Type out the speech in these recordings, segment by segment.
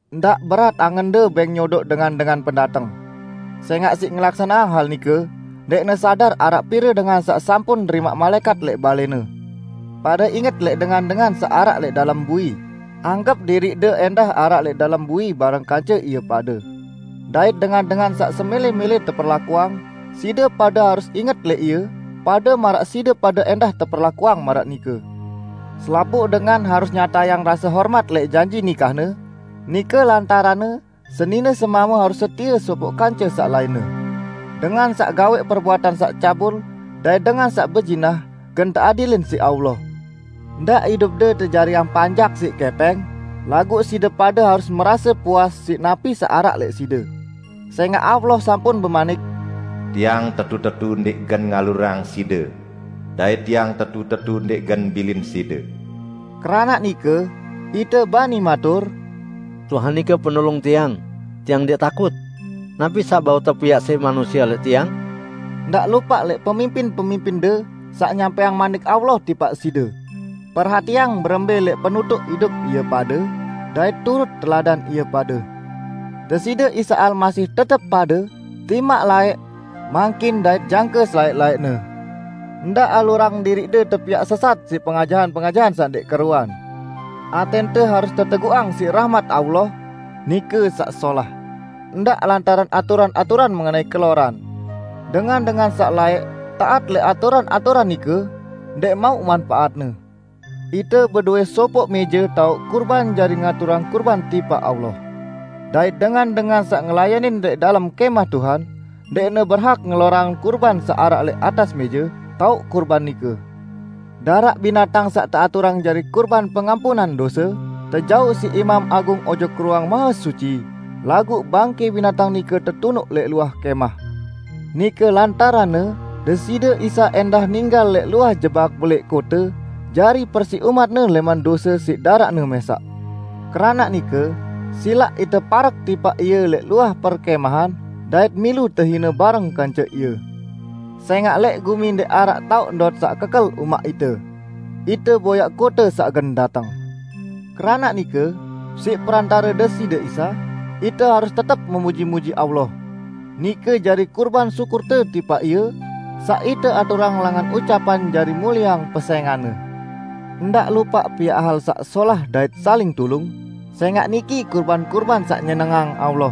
Ndaq berat angende bẽng nyodoq dengan-dengan pendateng. Sẽngaq siq ngelaksaneang hal nike, ndẽqne sadar araq pire dengan saq sampun nerimaq malaẽkat lẽq balẽne. Pade inget lẽq dengan-dengan saq araq lẽq dalem bui, anggep diriqde ẽndah araq lẽq dalem bui bareng kance ie pade. Dait dengan-dengan saq semẽlẽ-mẽlẽ teperlakuang, side pade harus inget lẽq ie pade maraq side pade ẽndah teperlakuang maraq nike. Selapuq dengan harus nyatayang rase hormat lẽq janji nikahne, nike lantaranne senine-semame harus setie sopoq kance saq lainne. Dengan saq gawẽq perbuatan saq cabul dait dengan saq bezinah gen teadilin siq Allah. Ndaq idupde tejariang panjak siq kẽpẽng, laguq side pade harus merase puas siq napi saq araq lẽq side. Sẽngaq Allah sampun bemanik, "Tiang tetu-tetu ndẽq gen ngalurang side dait Tiang tetu-tetu ndẽq gen bilin side." Keranaq nike ite bani matur, "Tuhan nike Penulung tiang, tiang ndẽq takut. Napi saq bau tepiaq siq manusie lẽq tiang?" Ndaq lupaq lẽq pemimpin-pemimpinde saq nyampẽang Manik Allah tipaq side. Perhatiang berembẽ lẽq penutuq idup ie pade dait turut teladan ie pade. Deside Isa Almasih tetep pade, timaq laẽq, mangkin dait jangke selaẽq-laẽqne. Ndaq alurang diriqde tepiaq sesat siq pengajahan-pengajahan saq ndẽq keruan. Atẽnte harus teteguqang siq rahmat Allah, nike saq solah; ndaq lantaran aturan-aturan mengenai keloran. Dengan-dengan saq laẽq taat lẽq aturan-aturan nike, ndẽq mauq manpaatne. Ite bedowẽ sopoq mẽje taoq kurban jari ngaturang kurban tipaq Allah. Dait dengan-dengan saq ngelayanin lẽq dalem Kẽmah Tuhan, ndẽqne berhak ngelorang kurban saq araq lẽq atas mẽje taoq kurban nike. Daraq binatang saq teaturang jari kurban pengampunan dose, tejauq siq imam agung ojok Ruang Mahesuci, laguq bangkẽ binatang nike tetunuq lẽq luah kẽmah. Nike lantaranne Deside Isa ẽndah ninggal lẽq luah jebak belẽq kote jari persiq umat-Ne lẽman dose siq daraq-Ne mẽsaq. Keranaq nike, silaq ite parek tipaq Ie lẽq luah perkẽmahan dait milu tehine bareng kance Ie. Sẽngaq lẽq gumi ndẽq araq taoq ndot saq kekel umaq ite; ite boyaq kote saq gen dateng. Keranaq nike, siq perantare Deside Isa, ite harus tetep memuji-muji Allah; nike jari kurban syukurte tipaq Ie, saq ite aturang langan ucapan jari mulieang pesẽngan-Ne. Ndaq lupaq piaq hal saq solah dait saling tulung, sẽngaq niki kurban-kurban saq nyenengang Allah.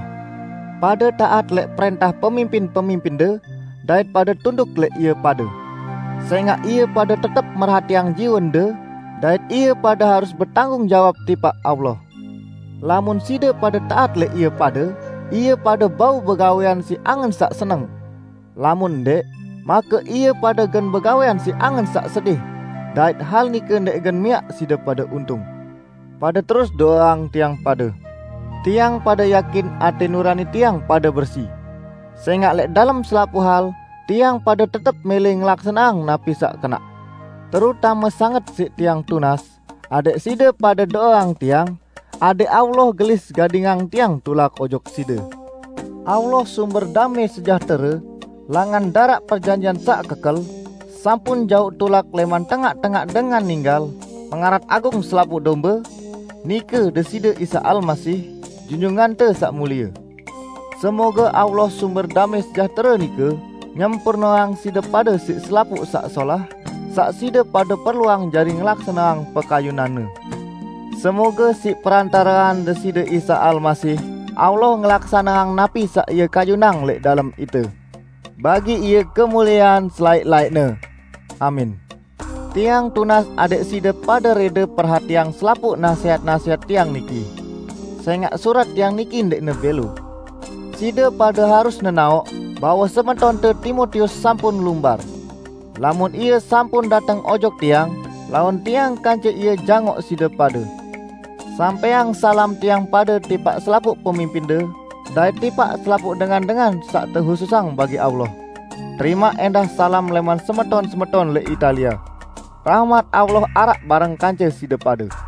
Pade taat lẽq prẽntah pemimpin-pemimpinde, dait pade tunduk lẽq ie pade. Sẽngaq ie pade tetep merhatiang jiwende, dait ie pade harus betanggung jawab tipaq Allah. Lamun side pade taat lẽq ie pade, ie pade bau begawẽan siq angen saq seneng; lamun ndẽq, make ie pade gen begawẽan siq angen saq sedih, dait hal nike ndẽq gen miaq side pade untung. Pade terus do'eang tiang pade. Tiang pade yakin atẽ nurani tiang pade bersi. Sẽngaq lẽq dalem selapuq hal tiang pade tetep mẽlẽ ngelaksaneang napi saq kenaq. Terutame sanget siq tiang tunas, adẽq side pade do'eang tiang adẽq Allah gelis gadingang tiang tulak ojok side. Allah sumber damẽ sejahtere, langan daraq perjanjian saq kekel, sampun jauq tulak lẽman tengaq-tengaq dengan ninggal Pengarat Agung selapuq dombe, nike Deside Isa Almasih, Junjungante Saq Mulie. Semoge Allah sumber damẽ sejahtere nike nyempurneang side pade siq selapuq saq solah saq side pade perluang jari ngelaksaneang pekayunan-Ne. Semoge siq perantarean Deside Isa Almasih, Allah ngelaksaneang napi saq Ie kayunang lẽq dalem ite. Bagi Ie kemuliean selaẽq-laẽqne! Amin. Tiang tunas adẽq side pade rẽde perhatiang selapuq nasẽhat-nasẽhat tiang niki, sẽngaq surat tiang niki ndẽqne bẽlo. Side pade harus nenaoq bahwe semetonte Timotius sampun lumbar. Lamun ie sampun dateng ojok tiang, laun tiang kance ie jangoq side pade. Sampẽang salam tiang pade tipaq selapuq pemimpinde dait tipaq selapuq dengan-dengan saq tehususang bagi Allah. Terimaq ẽndah salam lẽman semeton-semeton lẽq Italia. Rahmat Allah araq bareng kance side pade.